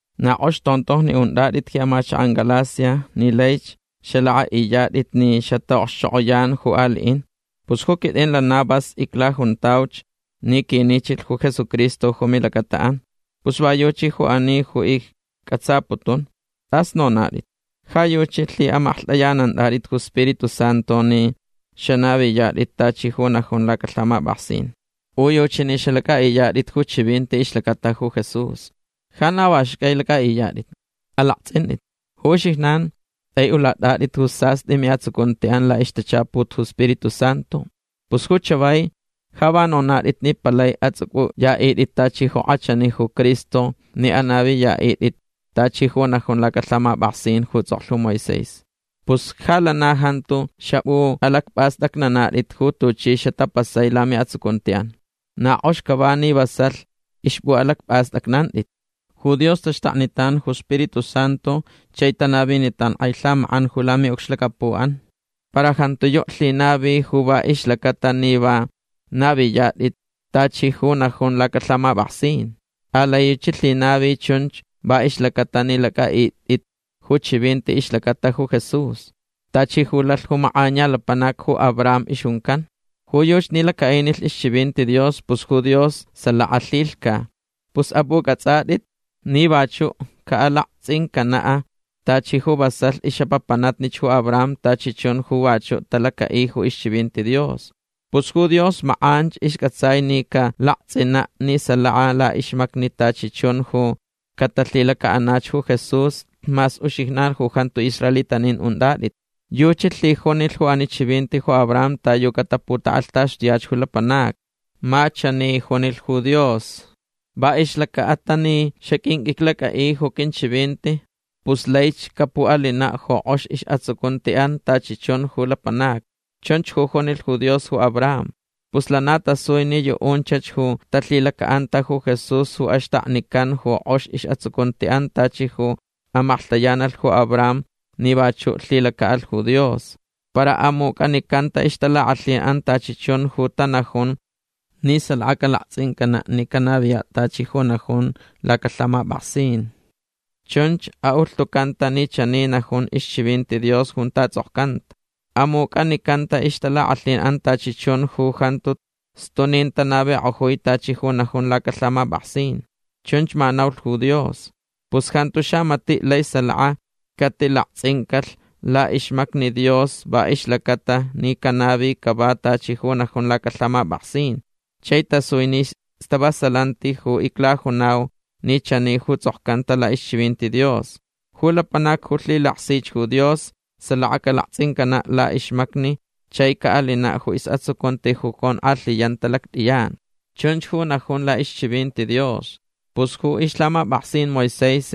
Na k'ox tontojni unt'at'it ji amachak'an Galacia ni laich xalak'a'iyat'it ni xata'okxchok'oyan ju ali'in. Pus ju quit'in lana vas iclajuntauch ni quinichilh ju Jesucristo ju milacata'an. Pus va yuchi ju ani ju icc'atsaputun. T'as nonat'it. Ja yuchi lhi'amaklht'ayanant'at'it ju Spiritu Santu ni xanaviyat'it tachi ju najun lacalhamap'aksin. U yuchi ni xalac'a'iyat'it ju chivinti ixlacata ju Jesús. Ja na va xcai lac'a'iyat'it. Alakts'int'it. Ju uxijnan t'ai'ulat'at'it ju sast'i mi'atsucunti'an la'ixtachaput ju Spiritu Santu. Pus ju chavai ja va nonat'it ni palai ats'uc'uya'it'it tachi ju k'achani ju Cristo ni anaviya'it'it tachi ju najun lacalhamap'aksin ju ts'oklh ju Moisés. Pus ja lana jantu xap'u'alacp'ast'acnanat'it ju tuchi xatapasai lami'atsucunti'an. Na k'ox cava ni vasalh xap'u'alacp'ast'acnanat'it. Ju Dios taxtaknitan ju Spiritu Santu chai tanavinitan k'ai lhamak'an ju lami'ucxlacapu'an. Para jantiyu' lhinavi ju va ixlaca'atalh ni va naviyat'it tachi ju najun lacalhamap'aksin. Alai yuchi lhinavi chunch va ixlaca'atalh ni lac'a'it'it ju chivinti ixlacata ju Jesús. Tachi ju lalh ju mak'aniya lapanac ju Abraham ixjuncan. Ju yuchi ni laca'inilh ixchivinti Dios pus ju Dios salaka lhilhca. Pus ap'uc'ats'at'it ni vachu' ca'alakts'incana' tachi ju vasalh ix'apapanatnich ju Abraham tachi chun ju vachu' talaca'i ju ixchivinti Dios. Pus ju Dios mak'anch isc'atsai ni calakts'ina' ni salaka la'ixmacni tachi chun ju catalhilaca'anach ju Jesús mas uxijnan ju jantu israelitanin unt'at'it. Yuchi lhijunilh ju ani chivinti ju Abraham ta yu cataputak'alhtaxtuyach ju lapanacni. Ma chani junilh ju Dios: “Va ixlaca'atalh ni xaq'uinq'uiclac'a'i ju quinchivinti pus laich capu'alina' ju k'ox is'atsucunti'an tachi chun ju lapanacni”. Chunch ju junilh ju Dios ju Abraham. Pus lana tasui ni yu'unchach ju talhilaca'anta ju Jesús ju axtaknican ju k'ox is'atsucunti'an tachi ju amaklhtayanalh ju Abraham ni vachu' lhilaca'alh ju Dios. Para amuc'anicanta ixtalak'alhin'an tachi chun ju tanajun ni salaka calakts'incana' ni canaviya' tachi ju najun lacalhamap'aksin. Chunch ju a'ulhtucanta ni chani najun ixchivinti Dios junta ts'okcanta: “Amuc'anicanta ixtalak'alhin'an tachi chun ju jantu stunin tanavik'ojui tachi ju najun lacalhamap'aksin”. Chunch ma naulh ju Dios. Pus jantu xamati' lai salaka catilakts'incalh la'ixmacni Dios va ixlacata ni canavi cava tachi ju najun lacalhamap'aksin. Chai tasui ni stavasalanti ju iclajunau ni chani ju ts'okcanta la'ixchivinti Dios: “Ju lapanac ju lhilaksich ju Dios salaka calakts'incana' la'ixmacni chai ca'alina' ju is'atsucunti ju conk'alhiyanta lact'iyan”. Chunch ju najun la'ixchivinti Dios. Pus ju ixlhamap'aksin Moisés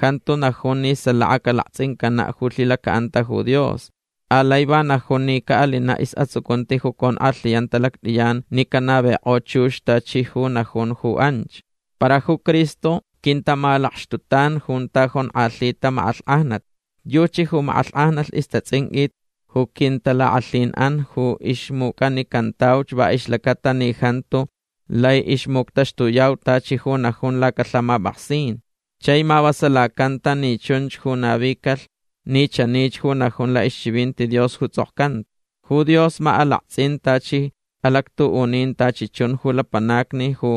jantu najun ni salaka calakts'incana' ju lhilaca'anta ju Dios. Alai va najun ni ca'alina' is'atsucunti ju conk'alhiyanta lact'iyan ni canavik'o chux tachi ju najun ju anch. Para ju Cristo quintamalakxtutan junta jonk'alhita mak'alhk'ajnat. Yuchi ju mak'alhk'ajnalh istats'inq'uit ju quintalak'alhin'an ju ixmuc'anicantauch va ixlacata ni jantu lai ixmuctaxtuyau tachi ju najun lacalhamap'aksin. Chai mavasalacanta ni chunch ju navicalh ni chanich ju najun la'ixchivinti Dios ju ts'okcanta: “Ju Dios ma alakts'in tachi alactu'unin tachi chun ju lapanacni ju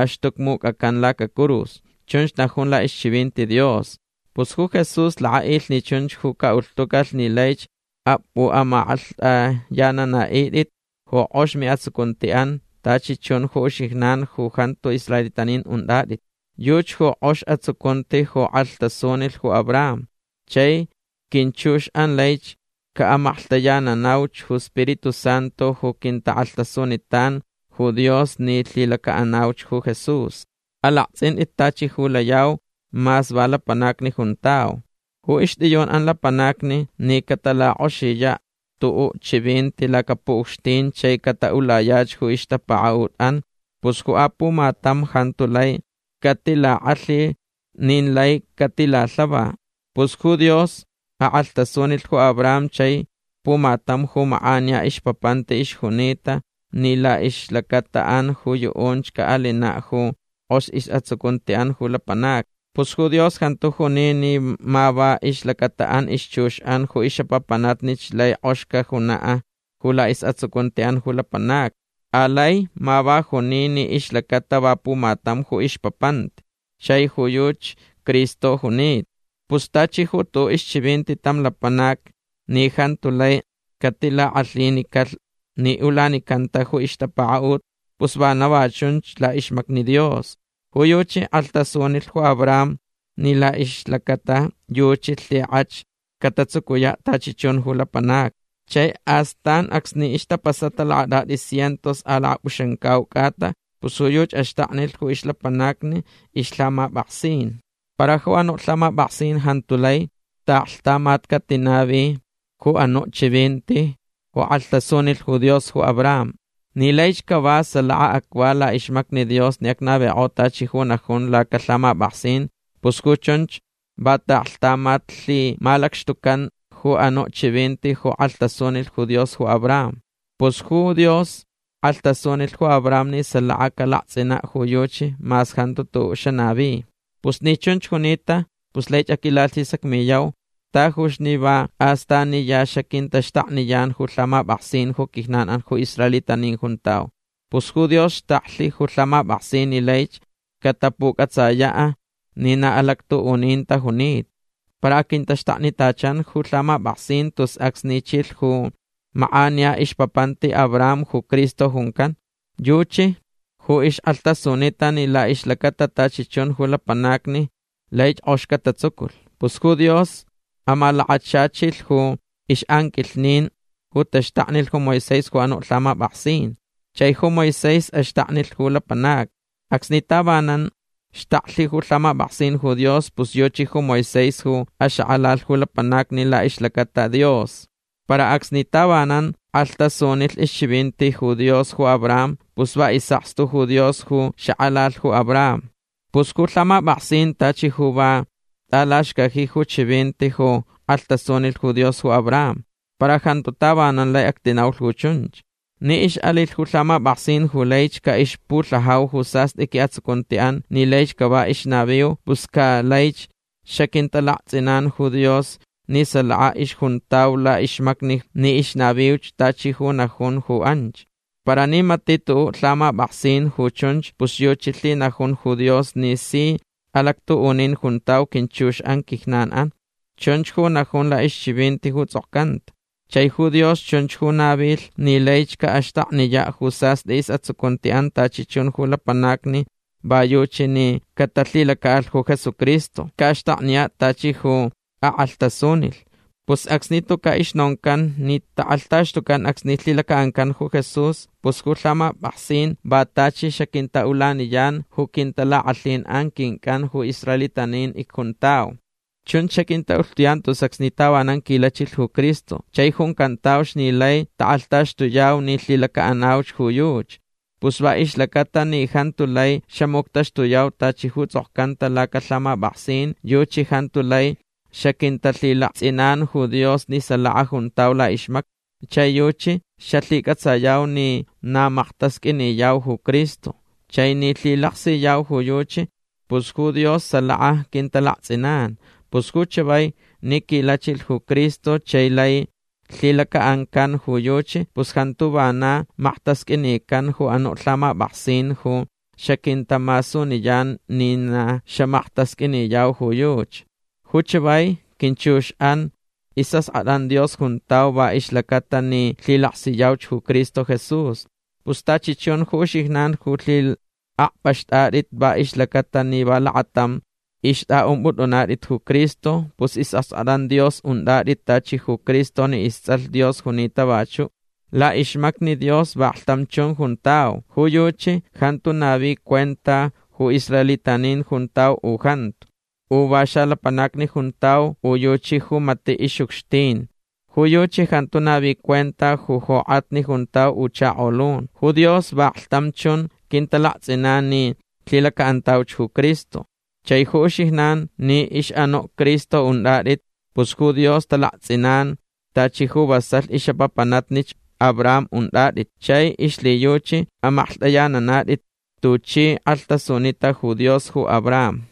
axtucmuc'acan lacacurus”. Chunch najun la'ixchivinti Dios. Pus ju Jesús lak'a'ilh ni chunch ju ca'ulhtucalh ni laich cap'u'amaklht'ayanana'it'it ju k'ox mi'atsucunti'an tachi chun ju uxijnan ju jantu israelitanin unt'at'it. Yuchi ju k'ox atsucunti ju k'alhtasunilh ju Abraham. Chai quinchux'an laich ca'amaklhtayananauch ju Spiritu Santu ju quintak'alhtasunitan ju Dios ni lhilaca'anauch ju Jesús. Alakts'int'it tachi ju layau mas va lapanacni juntau. Ju ixt'iyun'an lapanacni ni catalak'oxiya' tu'u' chivinti lacapu'ucxtin chai cata'ulayach ju ixtapaka'ut'an pus ju apumatam jantu lai catilak'alhilh nin lai catilalhava. Pus ju Dios ak'alhtasunilh ju Abraham chai pumatam ju mak'aniya ixpapanti ixjunita ni la'ixlacata'an ju yu'unch ca'alina' ju k'ox is'atsucunti'an ju lapanacni. Pus ju Dios jantu juni ni ma va ixlacata'an ixchux'an ju ix'apapanatnich laich k'ox cajuna' ju is'atsucunti'an ju lapanacni. Alai ma va juni ni ixlacata va pumatam ju ixpapanti. Chai ju yuchi Cristo junita. Pus tachi ju tu'u' ixchivinti tam lapanac ni jantu lai catilak'alhinicalh ni ulanicanta ju ixtapaka'ut pus vana va chunch la'ixmacni Dios. Ju yuchi k'alhtasunilh ju Abraham ni la'ixlacata yuchi lhik'ach catatsucuya' tachi chun ju lapanacni. Chai astan acsni ixtapasata lakat'at'i cientos a lakap'uxamcau c'ata pus ju yuchi axtaknilh ju ixlapanacni ixlhamap'aksin. Para ju anu' lhamap'aksin jantu lai ta'aklhtamat catinavi ju anu' chivinti ju k'alhtasunilh ju Dios ju Abraham. Ni laich cava salaka acva la'ixmacni Dios ni acnavik'o tachi ju najun lacalhamap'aksin pus ju chunch va ta'aklhtamat lhimalacxtucan ju anu' chivinti ju k'alhtasunilh ju Dios ju Abraham. Pus ju Dios k'alhtasunilh ju Abraham ni salaka calakts'ina' ju yuchi mas jantu tu'u' xanavi. Pus ni chunch junita pus laich aquilalhisacmiyau tajuch ni va astaniya xaquintaxtakniyan ju lhamap'aksin ju quijnan ju israelitanin icjuntau. Pus ju Dios xtaklh ju lhamap'aksin ni laich catapuc'atsaya' ni na alactu'unin tajunita. Para quintaxtaknitachan ju lhamap'aksin tus acsni chilh ju mak'aniya ixpapanti Abraham ju Cristo juncan. Yuchi ju ixk'alhtasunita ni la'ixlacata tachi chun ju lapanacni laich k'ox catatsuculh. Pus ju Dios amalakachachilh ju ix'anquilhnin ju taxtaknilh ju Moisés ju anu' lhamap'aksin. Chai ju Moisés axtaknilh ju lapanacni. Acsni tavanan xtaklh ju lhamap'aksin ju Dios pus yuchi ju Moisés ju axak'alalh ju lapanacni la'ixlacata Dios. Para acsni tavanan k'alhtasunilh ixchivinti ju Dios ju Abraham pus va is'akstu ju Dios ju xak'alalh ju Abraham. Pus ju lhamap'aksin tachi ju va t'alaxcaji ju chivinti ju k'alhtasunilh ju Dios ju Abraham. Para jantu tavanan lai actinaulh ju chunch. Ni ix'alilh ju lhamap'aksin ju laich ca'ixpulhajau ju sast'i qui'atsucunti'an ni laich cava ixnaviu pus ca laich xaquintalakts'inan ju Dios ni salaka ixjuntau la'ixmacni ni ixnaviuch tachi ju najunch ju anch. Para ni mati' tu'u' lhamap'aksin ju chunch pus yuchi lhinajun ju Dios ni si alactu'unin juntau quinchux'an quijnan'an. Chunch ju najun la'ixchivinti ju ts'okcanta. Chai ju Dios chunch ju navilh ni laich ca'axtakniya' ju sast'i is'atsucunti'an tachi chun ju lapanacni va yuchi ni catalhilaca'alh ju Jesucristo. Ca'axtakniya' tachi ju ak'alhtasunilh. Pus acsni tuca' ixnoncan ni tak'alhtaxtucan acsni lhilaca'ancan ju Jesús pus ju lhamap'aksin va tachi xaquinta'ulaniyan ju quintalak'alhin quinc'an ju israelitanin icjuntau. Chunch xaquinta'ulhtuyan tus acsni tavanan quilachilh ju Cristo chai juncantauch ni lai tak'alhtaxtuyau ni lhilaca'anauch ju yuchi. Pus va ixlaca'atalh ni jantu lai xamuctaxtuyau tachi ju ts'okcanta lacalhamap'aksin yuchi jantu lai xaquintalhilakts'inan ju Dios ni salaka juntau la'ixmacni. Chai yuchi xalhic'atsayau ni na maktasq'uiniyau ju Cristo. Chai ni lhilaksiyau ju yuchi pus ju Dios salaka quintalakts'inan. Pus ju chavai ni quilachilh ju Cristo chai lai lhilaca'ancan ju yuchi pus jantu vana maktasq'uinican ju anu' lhamap'aksin ju xaquintamasuniyan ni na xamaktasq'uiniyau ju yuchi. Ju chavai quinchux'an is'ask'at'an Dios juntau va ixlaca'atalh ni lhilaksiyauch ju Cristo Jesús. Pus tachi chun ju uxijnan ju lhi'akp'axt'at'it va ixlaca'atalh ni va lakatam ixt'a'ump'ut'unat'it ju Cristo pus is'ask'at'an Dios unt'at'it tachi ju Cristo ni ists'alh Dios junita vachu'. La'ixmacni Dios vaklhtam chun juntau. Ju yuchi jantu navi cuenta u israelitanin juntau u jantu. U va xalapanacni juntau u yuchi ju mati' ix'ucxtin. Ju yuchi jantu navi cuenta u jok'atni juntau u chakolun. Ju Dios vaklhtam chun quintalakts'inan ni lhilaca'antauch ju Cristo. Chai ju uxijnan ni ix'anu' Cristo unt'at'it pus ju Dios talakts'inan tachi ju vasalh ix'apapanatnich Abraham unt'at'it. Chai ixlhiyuchi amaklht'ayanana'it'it tuchi k'alhtasunita ju Dios ju Abraham.